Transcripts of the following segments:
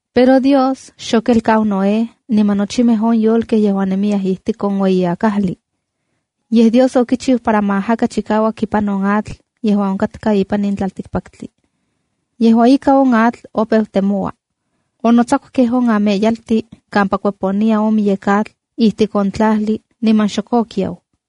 Pero Dios xokelkau Noé niman nochimej on yolkej yejuan nemiyaj ijtik on ueyi akajli. Yej Dios okichiu para ma ajaka chikauak ipan on atl yejuan onkatka ipan on tlaltikpaktli. Yejua ika, on atl opeu temoua. Onotsakukej on amelyaltin kampa kueponiya on miyek atl ijtik on tlajli, niman xok okiau.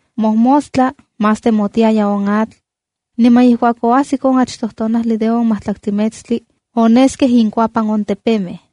Mojmostla más temotiaya on atl. Niman ijkuak oajsik on achtoj tonajli de on majtlaktli metstli, oneskej inkuapan on tepemej.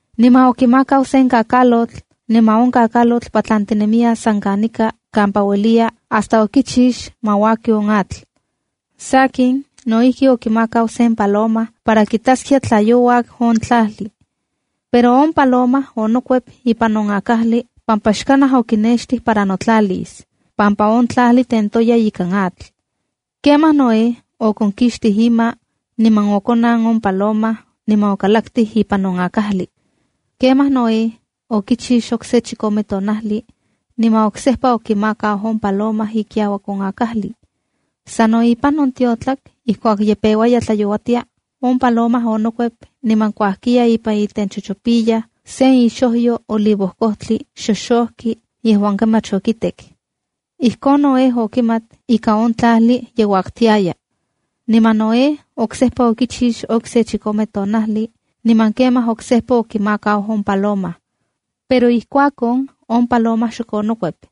Niman okimakau sen kakalotl. Niman on kakalotl patlantinemiya san kanika kampa ueliya hasta okichix ma uaki on atl. Sakin, no ijki okimakau sen paloma para kitaskia tla youak on tlajli. Pero on paloma onokuep ipan on akajli pampa xkanaj okinextij para notlalis, pampa on tlajli tentoya ikan atl. Kemaj Noé onkonkixtij ima, niman okonan on paloma niman okalaktij. Kemaj Noé okichix okse chikome tonajli niman oksejpa okimakau on paloma ikiauak on akajli. Sano ipan on tiotlak ijkuak ye peuaya tlayouatia, on paloma onokuep niman kuajkiya ipan itenchochopiyaj sen ixojyo olivojkojtli xoxoki yejuan kemach okitek. Ijkon Noé okimat ika on tlajli ye uaktiaya. Niman Noé oksejpa okichix okse chikome tonajli niman kemaj oksejpa okimakau on paloma. Pero ijkuak on, on paloma xok onokuep.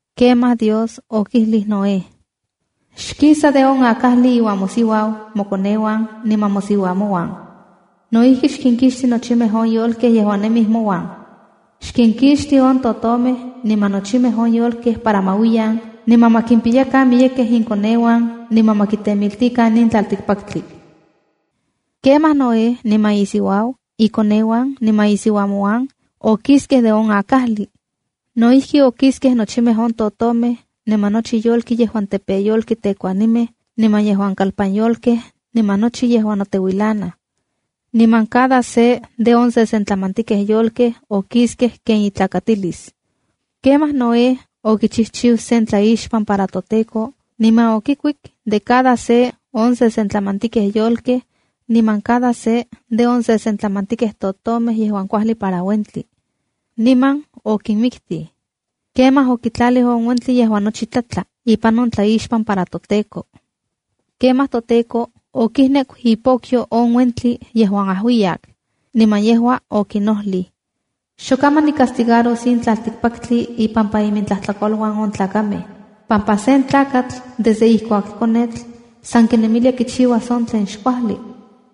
Kemaj Dios okijlij Noé: “Xkisa de on akajli iuan mosiuau, mokoneuan niman mosiuamonuan. No ijki, xkinkixti nochimej on yolkej yejuan nemij mouan. Xkinkixti on totomej niman nochimej on yolkej para ma uiyan, niman ma kimpiyakan miyekej inkoneuan niman ma kitemiltikan in tlaltikpaktli.” Kemaj Noé niman isiuau, ikoneuan niman isiuamonuan, okiskej de on akajli. No ijki, okiskej nochimej on totomej, niman nochi yolki yejuan tepeyolki tekuanimej, niman yejuan kalpanyolkej niman nochi yejuan noteuilanaj. Niman cada se de on sesentlamantikej yolkej okiskej ken itlakatilis. Kemaj Noé okichijchiu sen tlaixpan para toTEKO. Niman okikuik de cada se on sesentlamantikej yolkej niman cada se de on sesentlamantikej totomej yejuan kuajli para uentli. Niman okinmiktij, kemaj okitlalij on uentli yejuan nochi tlatla ipan on tlaixpan para toTEKO. Kemaj toTEKO okijneku ipokyo yejuan ajuiyak, niman yejua okinojlij: “Xokaman nicastigaros in tlaltikpaktli ipampa imintlajtlakoluan on tlakamej, pampa sen tlakatl desde ijkuak konetl san kinemilia kichiuas on tlen xkuajli.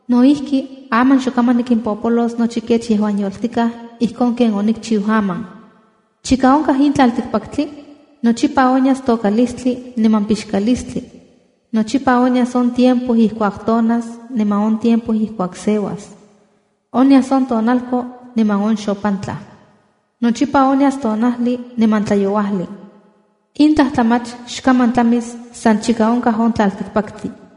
No ijki, aman xokaman nikimpolos nochi kech yejuan yoltikaj ijkon ken onikchiu aman. ’Chika onkaj in tlaltikpaktli, nochipa onyas tokalistli niman pixkalistli. Nochipa onyas on tiempo ijkuak tonas, niman on tiempo ijkuak seuas. Onyas on tonalko niman on xopantla. Nochipa onyas tonajli niman tlayouajli. In tlajtlamach xkaman tlamis san chika onkaj tlaltikpaktli.”